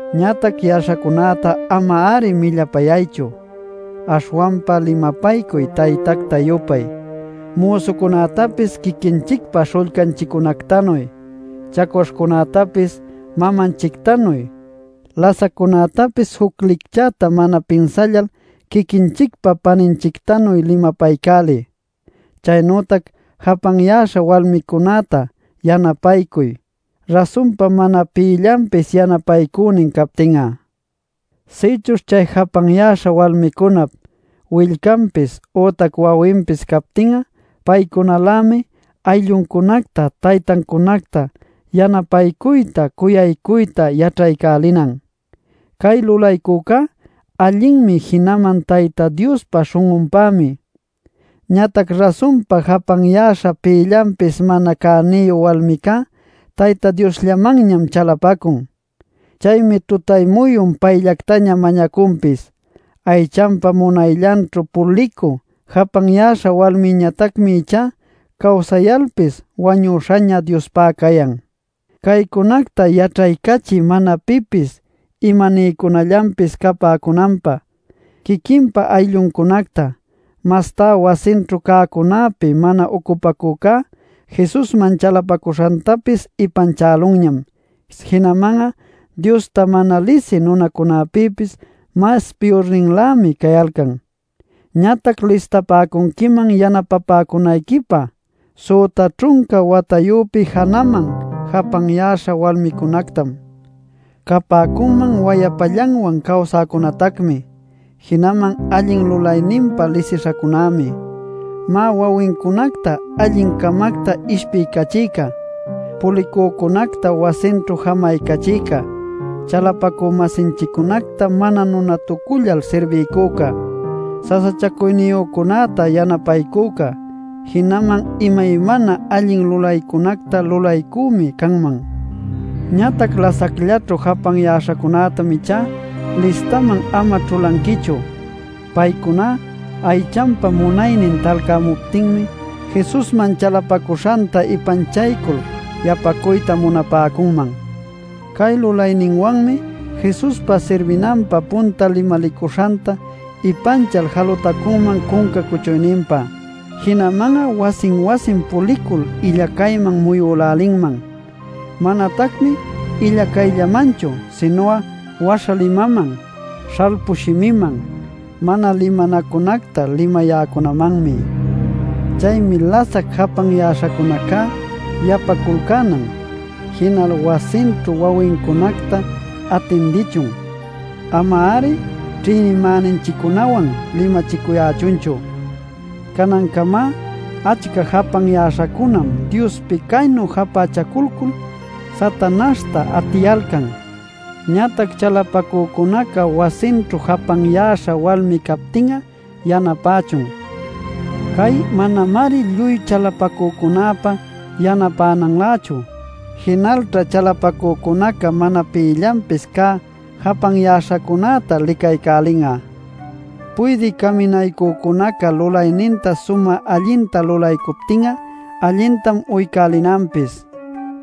Ñatac yaśhacunäta ama-ari millapayaychu. Aśhwanpa limapaycuy taytacta-yupay, müsucunätapis quiquinchicpa śhullcanchiccunactanuy, chacwaśhcunätapis mamanchictanuy; lasaccunätapis juc licchäta mana pinsallal quiquinchicpa paninchictanuy limapaycäliy. Chaynütac japanyäśha walmicunäta yanapaycuy, rasunpa mana pïllanpis yanapaycünin captin'a. Sïchuśh chay japanyäśha walmicunap willcanpis, ütac wawinpis captin'a paycunalämi aylluncunacta taytancunacta yanapaycuyta cuyaycuyta yaćhaycälinan. Cay lulaycuycá allinmi jinaman Tayta Diospa śhun'unpämi. Ñatac rasunpa japanyäśha pïllanpis mana cäniyu walmicá Tayta Diosllamanñam chalapacun. Chaymi tutay-muyun payllactaña mañacunpis. Aychanpa munayllanćhu pulicü japanyäśha walmiñatacmi ichá cawsayalpis wañüśhaña Diospá cayan. Caycunacta yaćhaycachiy mana pipis imaniycunallanpis capäcunanpä: quiquinpa aylluncunacta, mastá wasinćhu cäcunäpi mana ucupacücá, Jesusman chalapacuśhantapis ipanchälunñam. Jinaman'a Diosta mana lisï nunacunapïpis mas piyurninlämi cayalcan. Ñatac listapäcunquiman yanapapäcunayquipä süta ćhunca watayüpi janaman japanyäśha walmicunactam. Capäcunman wayapallanwan cawsäcunatacmi. Jinaman allin lulayninpa lisishacunämi. Má, wawincunacta allin-camacta ishpiycachïca, pulicücunacta wasinćhu jamaycachïca, chalapacü-masinchiccunacta mana nunatucullal sirbiycüca, sasachacuyniyücunäta yanapaycüca, jinaman imaymana allin lulaycunacta lulaycümi canman. Ñatac lasacllaćhu japanyäśhacunätam ichá listaman ama ćhulanquichu. Paycuná aychanpa munaynin talcämuptinmi Jesusman chalapacuśhanta ipanchaycul yapacuyta munapäcunman. Cay lulayninwanmi Jesuspa sirbinanpä punta limalicuśhanta ipanchal jalutacunman cunca cuchuyninpä. Jinaman'a wasin-wasin pulicul illacayman muyülälinman. Manatacmi illacayllamanchu sinu'a waśha limaman, śhalpu shimiman, mana limanacunacta limayäcunamanmi. Chaymi lasac japanyäśhacunaca yapaculcänan, jinal wasinćhu wawincunacta atindichun, ama-ari ćhïnimäninchiccunawan limachicuyächunchu. Canancamá achca japanchäśhacunam Diospi caynu japächaculcul Satanaśhta atiyalcan. Ñatac chalapacücunaca wasinćhu japanyäśha walmi captin'a yanapächun. Cay manamari lluy chalapacücunäpa yanapänanlächu. Jinalćha chalapacücunaca mana pïllanpis cä japanyäśhacunäta licaycälin'a. Puydï caminaycücunaca lulayninta sumä allinta lulaycuptin'a allintam uycälinanpis;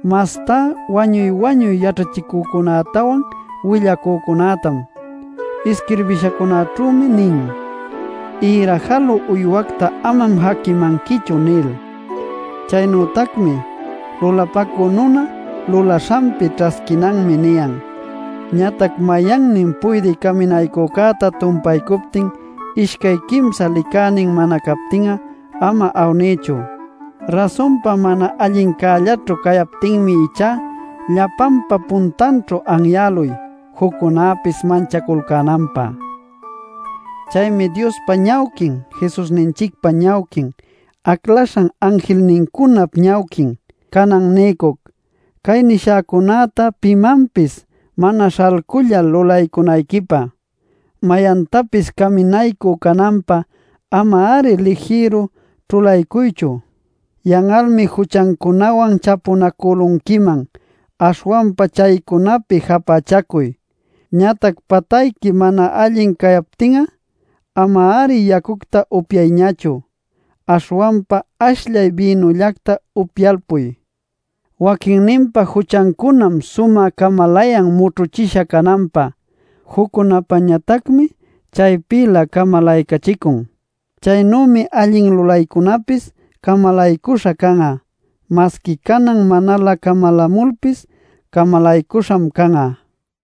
mastá wañuy-wañuy yaćhachïcunätawan willacücunätam. Isquirbishancunaćhümi nin: “Ïra jalü uywacta amam jaquimanquichu” nil. Chaynütacmi: “Lulapacü nuna, lulaśhanpi ćhasquinanmi” niyan. Ñatac mayannin puydï caminaycücäta tumpaycuptin ishcay quimsa licänin mana captin'a ama awniychu. Rasunpa mana allincällaćhu cayaptinmi ichá llapanpa puntanćhu anyäluy juccunäpis manchaculcänanpä. Chaymi Diospa ñawquin, Jesusninchicpa ñawquin, aclaśhan anjilnincunap ñawquin canan niycuc, cay nishäcunäta pimanpis mana śhalcullal lulaycunayquipä. Mayantapis caminaycü cananpä ama-ari lijïru ćhulaycuychu. Yan'almi juchancunawan chapunacülunquiman, aśhwanpa chaycunapi japächacuy. Ñatac patayqui mana allin cayaptin'a ama-ari yacucta upyayñachu, aśhwanpa ashllay bïnullacta upyalpuy. Waquinninpa juchancunam sumä camalayan mućhüchisha cananpä; Juccunäpañatacmi chaypïlä camalacachicun. Chaynümi allin lulaycunäpis camalaycuśha can'a; masqui canan manalä camalämulpis camalaycuśham can'a.